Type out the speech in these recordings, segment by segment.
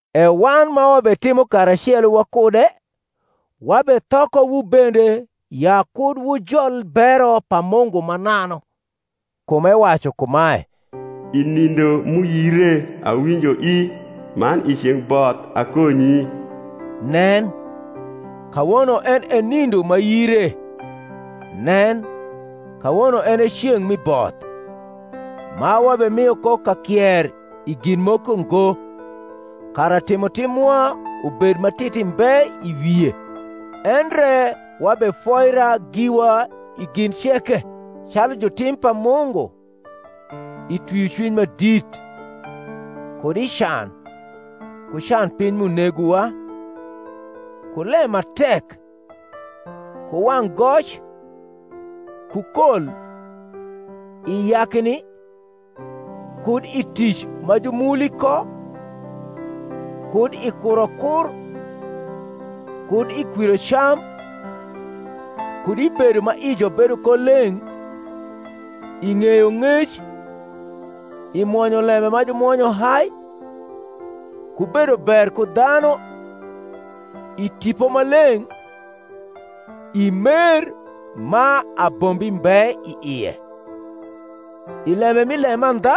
E wan ma wabetimo karacelo wakude wabethokowu bende ya kud wujol bero pa Mungu mananu (kum ewacu kumae, I nindo m’uyire awinjoi, Man i ceng’ both akonyi: nen, kawono en e nindo ma yire; nen, kawono en e ceng’ mi both): ma wabemio ko kakier i gin moko ngo, kara timotim mwa ubed ma titi mbe i wie; endre wabefoira giwa i gin ceke, calu jutim pa Mungu, i twiocwiny ma dit, kud i can, ku can piny m’unegowa, ku lem ma tek, ku wang’ goc, ku kol, i yakni, kud i tic ma jumuli ko, kud i kurokur, kud i kwirocam; kud i bedo ma ijo bedo ko leng’, i ng’eyong’ec, i mwonyolembe ma jumwonyo hai, ku bedo ber ku dhanu, i Tipo Maleng’, i mer ma abombi mbe i ie, i lembe mi lemandha,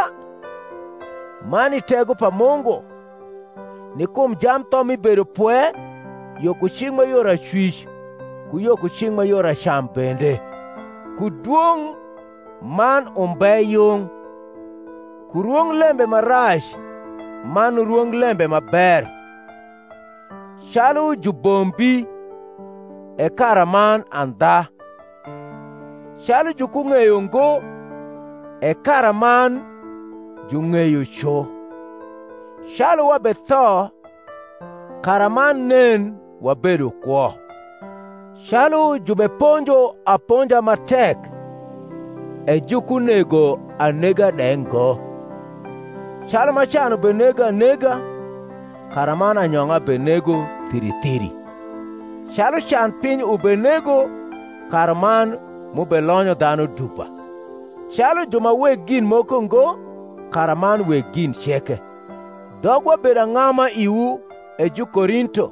man i tego pa Mungu; ni kum jamtho mi bedopwe yo ku cing’ ma yor acwic ku yo ku cing’ ma yor acam bende, ku dwong’ man umbe yung, ku rwonglembe ma rac man rwonglembe ma ber; calu jubombi, e karaman andha; calu jukung’eyo ngo, e karaman jung’eyo cu; calu wabetho, karaman nen, wabedo kwo; calu jubeponjo aponja ma tek, e jukunego anega de ngo; calu ma can ubenego anega, karaman anyong’a benego thiri thiri; calu can piny ubenego, karaman m’ubelonyo dhanu dupa; calu ju ma weg gin moko ngo, karaman weg gin ceke. Dhogwa bedo ang’ama iwu, E Jukorinto,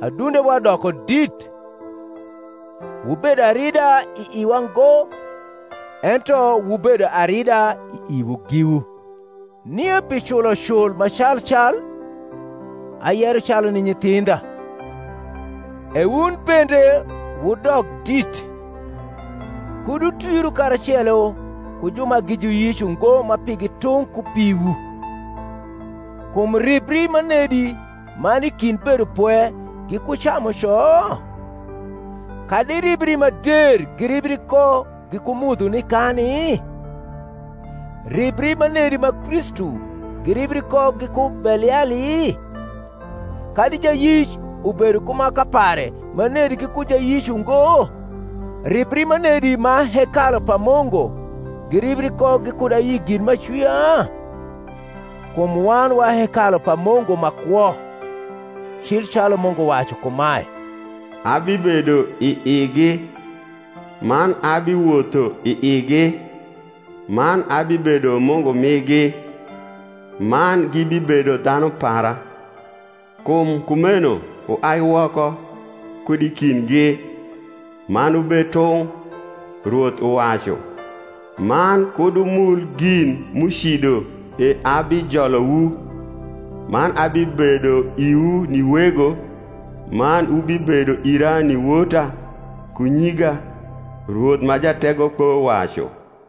adundewa doko dit. Wubedo arida i iwa ngo, ento wubedo arida i iwu giwu. Nie pi culocul ma calcal (ayero calu ni nyithindha), e wun bende wudok dit. Kud wutwiru karacelo ku ju ma gi juyic ungo ma pigi tung’ ku piwu: kum ribri manedi ma ni i kind bedopwe giku camuco? kadi ribri ma der giribri ko giku mudho ni kani? Ribri manedi ma Kristu giribri ko giku Beliali? kadi jayic ubedo ku maka pare manedi giku jayicungo? Ribri manedi ma hekalu pa Mungu giribri ko gikud ayi gin m’acwia? kum wan wa hekalu pa Mungu ma kwo; cil calu Mungu wacu kumae, Abibedo i igi, man abiwotho i igi; man abibedo Mungu migi, man gibibedo dhanu para. Kum kumeno Wuai woko kud i kindgi, man wubed tung’, Rwoth uwacu, Man kud wumul gin m’ucido; E abijolowu. Man abibedo iwu ni Wego, Man wubibedo ira ni wota ku nyiga, Rwoth ma Jategokpo wacu.